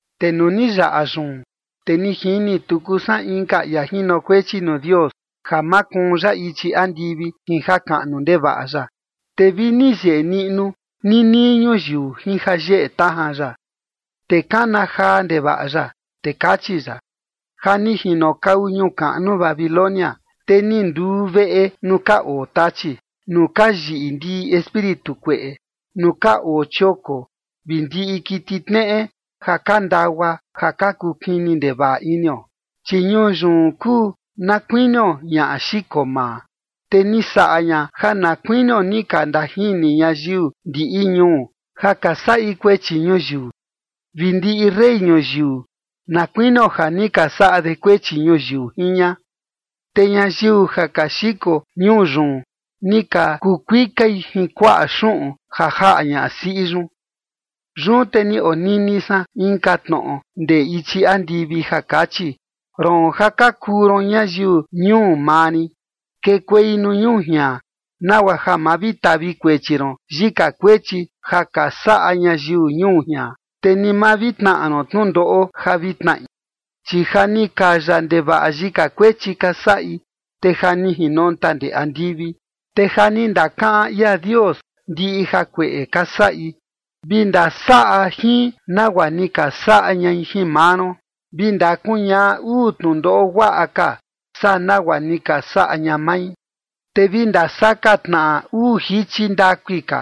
Te nuu ni yaꞌa yun, te ni jini tuku san inka ia jinokuechi nuu Dios ja makuun ya ichi andivi jin jakaꞌnu ndevaꞌa ya, te vi ni yeꞌe niꞌnu ninii ñuyiu jin jayeꞌe tajan ya. Te kana jaa ndevaꞌa ya, te kachi ya: Ja ni jinokau ñuu kaꞌnu Babilonia, te ni nduu veꞌe nuu ka oo tachi, nuu ka yiꞌi ndiꞌi espíritu kueꞌe, nuu ka oo chioko vi ndiꞌi kiti tneꞌe ja ka ndagua ja ka kuu kini ndevaꞌa inio. Chi ñuu yun kuu na kuinio ñaꞌa xiko maa, te ni saꞌa ña ja na kuinio ni ka ndajini ñayiu ndiꞌi ñuu, ja ka saꞌi kuechi ñuyiu, vi ndiꞌi rey ñuyiu, na kuinio ja ni ka saꞌa de kuechi ñuyiu jin ña. Te ñayiu ja ka xiko ñuu yun ni ka kuu kuikai jin kuaꞌa xuꞌun ja jaꞌa ñasiꞌi yun. Yun te ni onini san inka tnoꞌo ndee ichi andivi ja kachi: Roon ja ka kuu ron ñayiu ñuu maa rin, kekuei nuu ñuu jian, nagua ja ma vi tavi kuechi ron yika kuechi ja ka saꞌa ñayiu ñuu jian, te ni ma vi tnaꞌa ron tnundoꞌo ja vi tnaꞌi. Chi ja ni kaya ndevaꞌa yika kuechi ka saꞌi, te ja ni jinonta ndee andivi, te ja ni ndakaꞌan ia Dios ndiꞌi jakueꞌe ka saꞌi. Vi ndasaꞌa jin nagua ni ka saꞌa ñai jin maa ron, vi ndakuñaꞌa uu tnundoꞌo guaꞌa ka saa nagua ni ka saꞌa ña mai, te vi ndasaka tnaꞌa uu jichi ndakui ka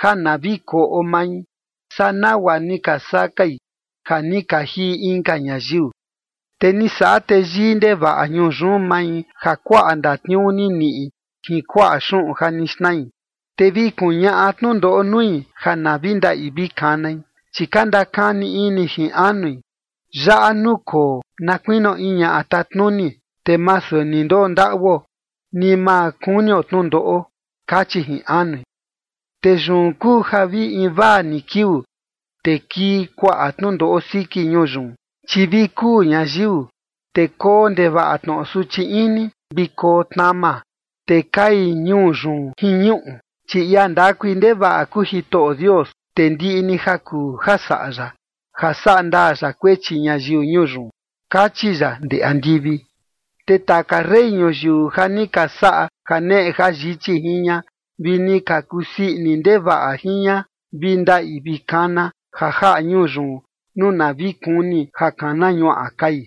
ja na vi koꞌo mai saa nagua ni ka sakai ja ni ka jiꞌi inka ñayiu. Te ni saꞌa teyii ndevaꞌa ñuu yun mai ja kuaꞌa ndatniuu ni niꞌi jin kuaꞌa xuꞌun ja ni xnai, te vi kuñaꞌa tnundoꞌo nui ja na vi ndaꞌi vi kanai, chi ka ndakani ini jin anui: “Yaꞌa nukoo na kuinio in ñaꞌa tatnuni, te masu ni ndondaꞌuo, ni ma kunio tnundoꞌo”. Kachi jin anui. Te yun kuu ja vi invaa ni kiuu, te kii kuaꞌa tnundoꞌo siki ñuu yun, chi vi kuu ñayiu, te koo ndevaꞌa tnoꞌo suchi ini, vi koo tnama, te kai ñuu yun jin ñuꞌu, chi ia ndakui ndevaꞌa kuu Jitoꞌo Dios, te ndiꞌi ni ja kuu ja saꞌa ya, ja sandaa ya kuechi ñayiu ñuu yun. Kachi ya ndee andivi. Te taka rey ñuyiu ja ni ka saꞌa janeꞌe jayichi jin ña vi ni ka kusii ini ndevaꞌa jin ña, vi ndaꞌi vi kana ja jaꞌa ñuu yun, nuu na vi kuni ja kana ñuaꞌa kai.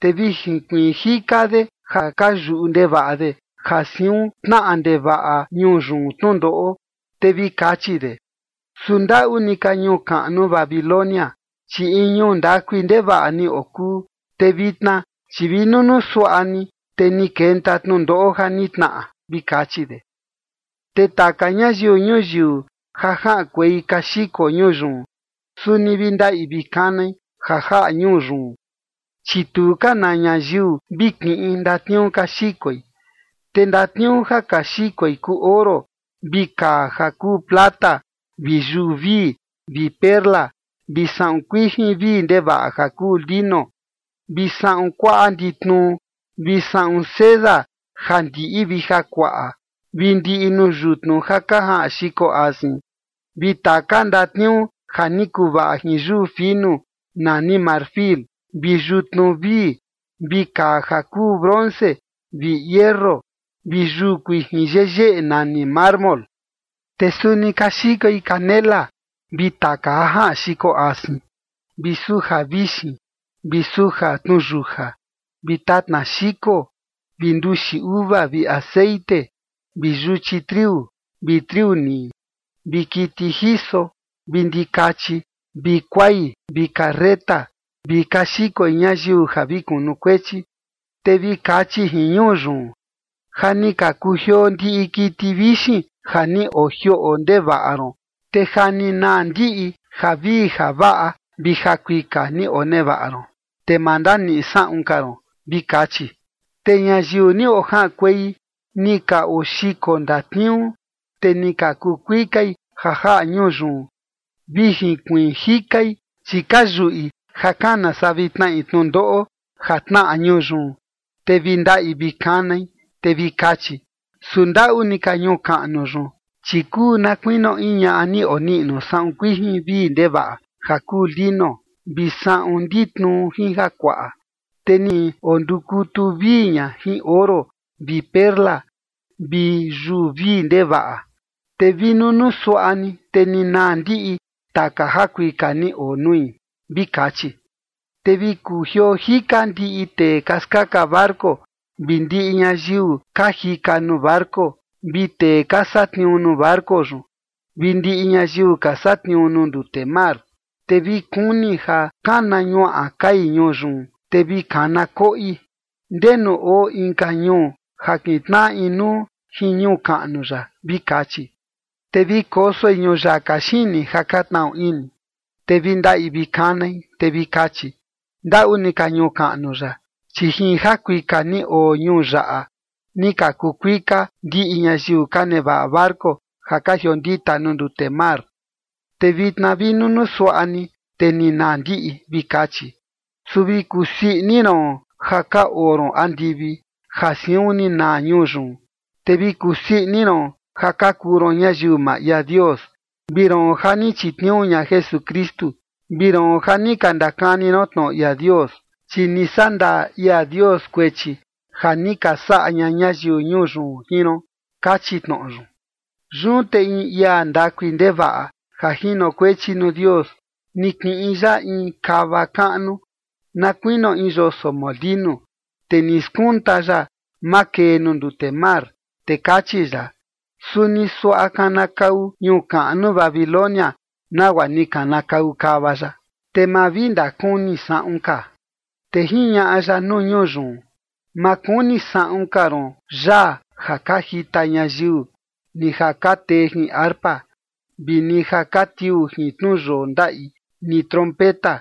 Te vi jinkuiin jika de ja ka yuꞌu ndevaꞌa de ja siun tnaꞌa ndevaꞌa ñuu yun tnundoꞌo, te vi kachi de: ―¡Su ndaꞌu ni ka ñuu kaꞌnu Babilonia! Chi in ñuu ndakui ndevaꞌa ni okuu, te vitna, chi vi nunuu suaꞌa ni, te ni kenta tnundoꞌo ja ni tnaꞌa ―vi kachi de. Te taka ñayiu ñuyiu ja jaꞌankuei ka xiko ñuu yun, suni vi ndaꞌi vi kanai ja jaꞌa ñuu yun, chi tu ka na ñayiu vi kiꞌin ndatniuu ka xikoi. Te ndatniuu ja ka xikoi kuu oro, vi kaa ja kuu plata, vi yuu vii, vi perla, vi saꞌun kuijin vii ndevaꞌa ja kuu lino, vi saꞌun kuaꞌa nditnuu, vi saꞌun seda ja ndiꞌi vi jakuaꞌa, vi ndiꞌi nuu yutnu ja ka jaꞌan xiko asin, vi taka ndatniuu ja ni kuvaꞌa jin yuu finu nani marfil, vi yutnu vii, vi kaa ja kuu bronce, vi hierro vi yuu kuijin yeyeꞌe nani mármol. Te suni ka xikoi canela vi taka ja jaꞌan xiko asin, vi suja vixin vi suja tnuyuja, vi tatna xiko, vi nduxi uva vi texeꞌen vi yuchi triu, vi triu nii, vi kiti jiso, vi ndikachi, vi kuai vi carreta, vi ka xikoi ñayiu ja vi kunukuechi. Te vi kachi jin ñuu yun: ―Ja ni ka kujioo ndiꞌi kiti vixin ja ni ojioꞌo ndevaꞌa ron, te ja ni naa ndiꞌi javii javaꞌa vi jakuika ni onevaꞌa ron, te ma ndaniꞌi saꞌun ka ron ―vi kachi. Te ñayiu ni ojaꞌankuei ni ka oxiko ndatniuu, te ni ka kuu kuikai ja jaꞌa ñuu yun, vi jinkuiin jikai, chi ka yuꞌi ja kana saa vi tnaꞌi tnundoꞌo ja tnaꞌa ñuu yun, te vi ndaꞌi vi kanai. Te vi kachi: Su ndaꞌu ni ka ñuu kaꞌnu yun, chi kuu na kuinio in ñaꞌa ni oniꞌnu saꞌun kuijin vii ndevaꞌa ja kuu lino, vi saꞌun nditnuu jin jakuaꞌa. Te ni ondukutu vii ña jin oro vi perla vi yuu vii ndevaꞌa. Te vi nunuu suaꞌa ni, te ni naa ndiꞌi taka jakuika ni oo nui. Vi kachi. Te vi kujioo jika ndiꞌi tee ka skaka barco vi ndiꞌi ñayiu ka jika nuu barco vi tee ka satniuu nuu barco yun vi ndiꞌi ñayiu ka satniuu nuu ndute mar. Te vi kuni ja kana ñuaꞌa kai ñuu yun, te vi kana koꞌi: ―¿Ndenu oo inka ñuu ja kintnaꞌa inuu jin ñuu kaꞌnu yaꞌa? ―vi kachi. Te vi kosoi ñuyaka xini, ja ka tnaꞌu ini, te vi ndaꞌi vi kanai, te vi kachi: Ndaꞌu ni ka ñuu kaꞌnu yaꞌa, chi jin jakuika ni oo ñuu yaꞌa ni ka kuu kuika ndiꞌi ñayiu ka nevaꞌa barco ja ka jiondita nuu ndute mar. Te vitna vi nunuu suaꞌa ni, te ni naa ndiꞌi. Vi kachi. Su vi kusii ini ron ja ka oo ron andivi, ja siun ni naa ñuu yun. Te vi kusii ini ron ja ka kuu ron ñayiu maa ia Dios, vi roon ja ni chitniuu ña Jesukristu, vi roon ja ni ka ndakani ron tnoꞌo ia Dios, chi ni sandaa ia Dios kuechi ja ni ka saꞌa ña ñayiu ñuu yun jin ron. Kachi tnoꞌo yun. Yun te in ia ndakui ndevaꞌa ja jinokuechi nuu Dios ni kiꞌin ya in kava kaꞌnu na kuinio in yoso molinu, te ni skunta ya makee nuu ndute mar, te kachi ya: Suni suaꞌa kanakau ñuu kaꞌnu Babilonia nagua ni kanakau kava yaꞌa, te ma vi ndakuni saꞌun ka. Te jiñaꞌa ya nuu ñuu yun: Ma kuni saꞌun ka ron yaa ja ka jita ñayiu ni ja ka tee jin arpa vi ni ja vi tiuu jin tnuyoo ndaꞌi ni trompeta.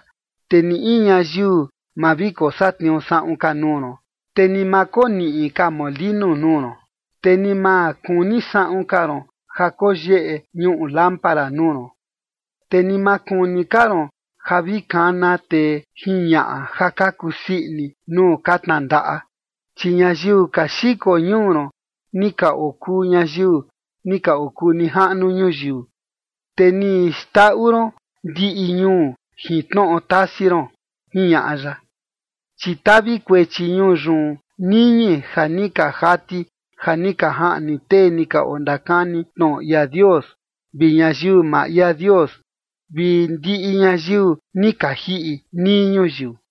Te ni in ñayiu ma vi kosatniuu saꞌun ka nuu ron, te ni ma koniꞌi ka molinu nuu ron. Te ni ma kuni saꞌun ka ron ja koyeꞌe ñuꞌu lámpara nuu ron. Te ni ma kuni ka ron ja vi kana tee jin ñaꞌa ja ka kusii ini nuu ka tnandaꞌa. Chi ñayiu ka xiko ñuu ron, ni ka okuu ñayiu ni ka okuu nijaꞌnu ñuyiu, te ni xndaꞌu ron ndiꞌi ñuu jin tnoꞌo tasi ron. Jiñaꞌa ya. Chi tavi kuechi ñuu yun niñi ja ni ka jati ja ni ka jaꞌni tee ni ka ondakani tnoꞌo ia Dios, vi ñayiu maa ia Dios, vi ndiꞌi ñayiu ni ka jiꞌi nii ñuyiu.